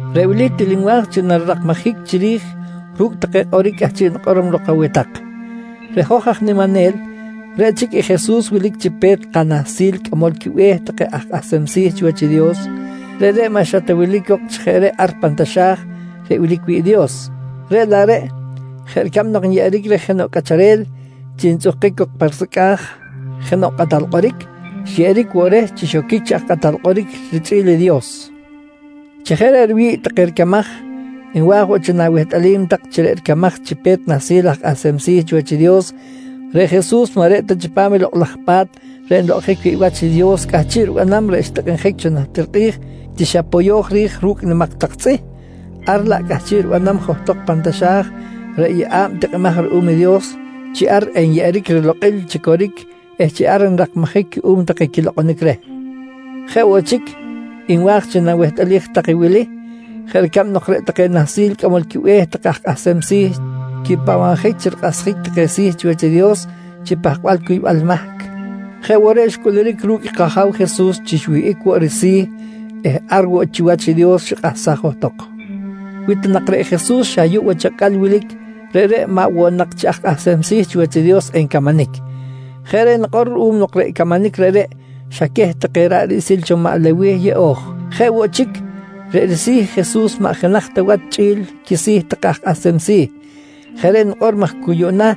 Reꞌ wili til nwa̱j chi narirakmajic chiri̱j ru̱cꞌ take kꞌoric cꞌahchiꞌ nikꞌorom lok aweh tak: Reꞌ hoj aj niminel, reꞌ chic i Jesus wilic chi Pe̱t kaNahsil Cꞌamol quiBe̱h take aj Kꞌahsem Si̱ chiwach i Dios. Reꞌreꞌ maꞌ xa ta wilic cok chi jeꞌ reꞌ ar pan taxa̱j reꞌ wilic wi̱ꞌ i Dios, reꞌ laꞌ reꞌ, jeꞌ ricab nok nyeꞌeric reh jenoꞌ cꞌacharel chi ntzꞌuhkic cok pa risecꞌa̱j jenoꞌ kꞌatal kꞌoric, xyeꞌeric woꞌ reh chi xoquic chi aj kꞌatal kꞌoric richꞌi̱l i Dios. Chi jeꞌ reꞌ riwi̱ꞌ take ricamaj, nwa̱j woꞌ chi nawehtꞌalim tak chi reꞌ ricamaj chi Pe̱t Nahsil aj Kꞌahsem Si̱ chiwach i Dios reꞌ Jesus maꞌ reꞌ ta chipam i Lokꞌ laj Pa̱t reꞌ nlokꞌonjic wi̱ꞌ wach i Dios cꞌahchiꞌ ribanam reꞌ xtikꞌinjic cho najtir kꞌi̱j chi xa poyo̱j ri̱j ru̱cꞌ nimak tak tzꞌih, ar laꞌ cꞌahchiꞌ ribanam johtok pan taxa̱j reꞌ yeꞌa̱b tikꞌimaj ruꞌum i Dios chi ar enyeꞌeric rilokꞌil chi coric eh chi ar nrakmajic cuꞌum take quilokꞌonic reh. Jeꞌ woꞌ chic, nwa̱j chi nawehtꞌalij tak i wili: Jeꞌ ricab nok reꞌ take Nahsil Cꞌamol quiBe̱h take aj kꞌahsem si̱ quipahbabjic chi rikꞌahsjic take si̱ chiwach i Dios chi pahkbal cuybal mahc, jeꞌ woꞌ reꞌ xcꞌuluric ru̱cꞌ i kAja̱w Jesus chi xwihꞌic woꞌ risi̱ eh ar woꞌ chiwach i Dios xikꞌahsaj johtok. Wi ta nak reꞌ Jesus xa ayuꞌ wach acꞌal wilic, reꞌreꞌ maꞌ woꞌ nak chi aj kꞌahsem si̱ chiwach i Dios encamanic. Jeꞌ reꞌ nikꞌor ruꞌum nok reꞌ camanic reꞌreꞌ xa queh take ra̱ꞌ riꞌsil cho maꞌ Lewih yeꞌo̱j. Jeꞌ woꞌ chic, reꞌ risi̱ i Jesus maꞌ jenaj ta wach chꞌi̱l i quisi̱ take aj kꞌahsem si̱. Jeꞌ reꞌ nikꞌor maj cu yuꞌna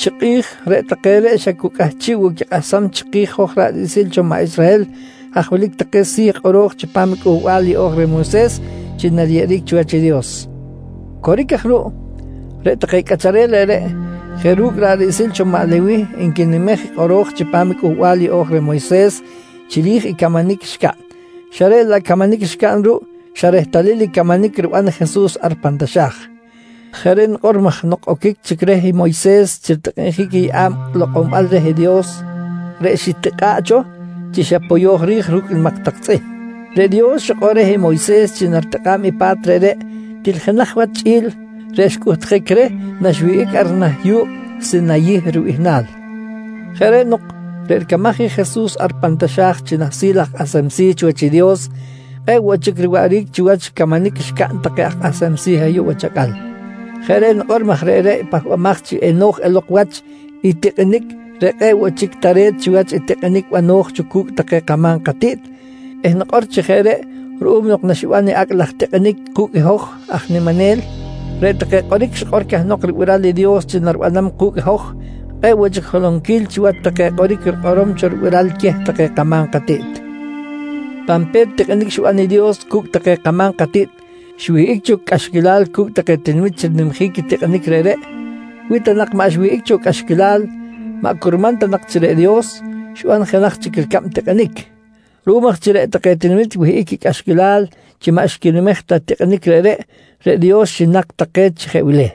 chi kꞌi̱j reꞌ take reꞌ xa cu cꞌahchiꞌ woꞌ quikꞌahsam chiki̱j hoj ra̱ꞌ riꞌsil cho maꞌ Israhel haj wilic take si̱ kꞌoro̱j chipam i Cꞌuhbal Yeꞌo̱j reh Moyses chi nariyeꞌeric chiwach i Dios. Coric aj ruꞌ, reꞌ take cꞌacharel reꞌreꞌ jeꞌ ru̱cꞌ ra̱ꞌ riꞌsil cho maꞌ Lewih nquinimej i kꞌoro̱j chipam i Cꞌuhbal Yeꞌo̱j reh Moyses chiri̱j i camanic xcaꞌn, xa reꞌ laꞌ i camanic xcaꞌn ruꞌ xa rehtalil i camanic riban i Jesus ar pan taxa̱j. Jeꞌ reꞌ nikꞌor maj nok oquic chic reh Moyses chi ritikꞌinjic i yeꞌa̱b lokꞌonbal reh Dios reꞌ xitikꞌa̱ꞌ cho chi xa poyo̱j ri̱j ru̱cꞌ nimak tak tzꞌih, reꞌ Dios xikꞌor reh Moyses chi naritikꞌa̱b i pa̱t reꞌreꞌ til jenaj wach chꞌi̱l reꞌ xcꞌuhtjic reh naxwihꞌic ar nah yu̱kꞌ Sinayih Ribihnal. Jeꞌ reꞌ nok, reꞌ ricamaj i Jesus ar pan taxa̱j chi nahsil aj kꞌahsem si̱ chiwach i Dios, kꞌe̱ꞌ woꞌ chic riwaꞌric chiwach i camanic xcaꞌn take aj kꞌahsem si̱ ayuꞌ wach acꞌal. Jeꞌ reꞌ nikꞌor maj reꞌreꞌ i pahbamaj chi eno̱j elok wach i tikꞌinic reꞌ kꞌe̱ꞌ woꞌ chic tare̱t chiwach i tikꞌinic bano̱j cho cu̱cꞌ take kama̱m katiꞌt eh nikꞌor chi jeꞌ reꞌ ruꞌum nok naxiban i acꞌ laj tikꞌinic ku̱cꞌ i hoj aj niminel, reꞌ take kꞌoric xikꞌor cahnok ribiral i Dios chi naribanam ku̱cꞌ hoj kꞌe̱ꞌ woꞌ chic holonquil chiwach take kꞌoric rikꞌorom cho ribiral queh take kama̱m katiꞌt. Pan pe̱t tikꞌinic xiban i Dios cu̱cꞌ take kama̱m katiꞌt, xwihꞌic cho cꞌaxquilal cu̱cꞌ take tinamit chi rinimjic i tikꞌinic reꞌreꞌ. Wi ta nak maꞌ xwihꞌic cho cꞌaxquilal, maꞌ curman ta nak chi reꞌ Dios xiban jenaj chic ricab tikꞌinic. Ruꞌum aj chi reꞌ take tinamit wihꞌic quicꞌaxquilal chi maꞌ xquinimej ta i tikꞌinic reꞌreꞌ, reꞌ Dios xinak take chi jeꞌ wili: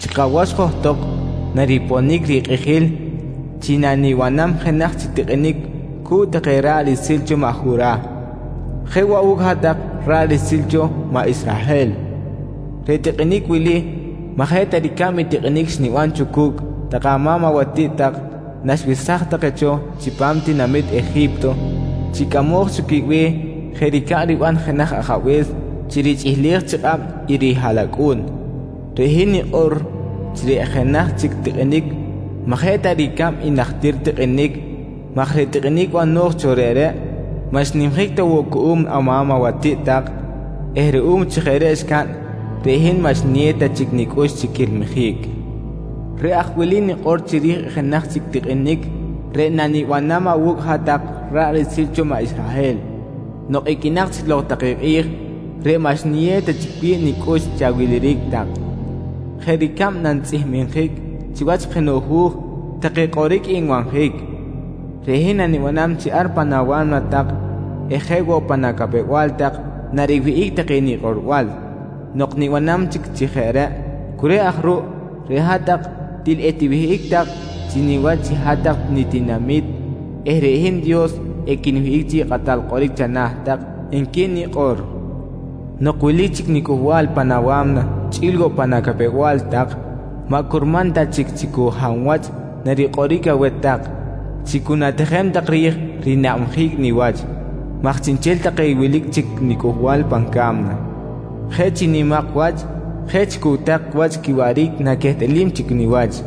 “Chi kawach johtok nariponic rikꞌijil chi nanibanam jenaj chic tikꞌinic cu̱cꞌ take ra̱ꞌ riꞌsil cho maꞌ Jurah jeꞌ woꞌ awu̱cꞌ hat-tak ra̱ꞌ riꞌsil cho maꞌ Israhel. Reꞌ tikꞌinic wili, maꞌ jeꞌ ta ricab i tikꞌinic xniban cho cu̱cꞌ take ama̱m awatiꞌt tak naxwesaj take cho chipam tinamit Eji̱pto chi cꞌamoj cho quibe̱h jeꞌ ricab riban jenaj ajabe̱s chi richꞌihlej chi kꞌab i rihaꞌlacꞌu̱n. Reꞌ hin nikꞌor chi reꞌ jenaj chic tikꞌinic maꞌ jeꞌ ta ricab i najtir tikꞌinic maj reꞌ tikꞌinic bano̱j cho reꞌreꞌ maꞌ xnimjic ta woꞌ cuꞌum ama̱m awatiꞌt tak eh ruꞌum chi jeꞌ reꞌ xcaꞌn, reꞌ hin maꞌ xniyew ta chic nicꞌux chi quilmijic. Reꞌ aj wili nikꞌor chiri̱j i jenaj chic tikꞌinic reꞌ nanibanam awu̱cꞌ hat-tak ra̱ꞌ riꞌsil cho maꞌ Israhel nok iqꞌuinak chic lok take kꞌi̱j reꞌ maꞌ xniyew ta chic wi̱ꞌ nicꞌux chi awiliric tak: ‘Jeꞌ ricab nantzꞌihmjic chiwach jenoꞌ hu̱j take kꞌoric nbanjic, reꞌ hin nanibanam chi ar pan awa̱mna tak eh jeꞌ woꞌ pan acapew-bal tak nariwihꞌic take nikꞌorbal. Nok nibanam chic chi jeꞌ reꞌ, cu reꞌ aj ruꞌ, reꞌ hat-tak til etiwihꞌic tak chi niwach chi hat-tak nitinami̱t eh reꞌ hin Dios equinwihꞌic chi kꞌatal kꞌoric chana̱ tak, nqui nikꞌor. Nok wilic chic nicꞌuhbal pan awa̱mna chꞌi̱l woꞌ pan acapew-bal tak, maꞌ curman ta chic chi cu hab wach narikꞌoric aweh tak chi cu na̱tijem tak ri̱j rinabjic niwach, maj chiꞌnchel take wilic chic nicꞌuhbal pan ca̱mna, jeꞌ chi nimak wach, jeꞌ chi cucꞌtak wach quiwaꞌric naquehtꞌalim chic niwach.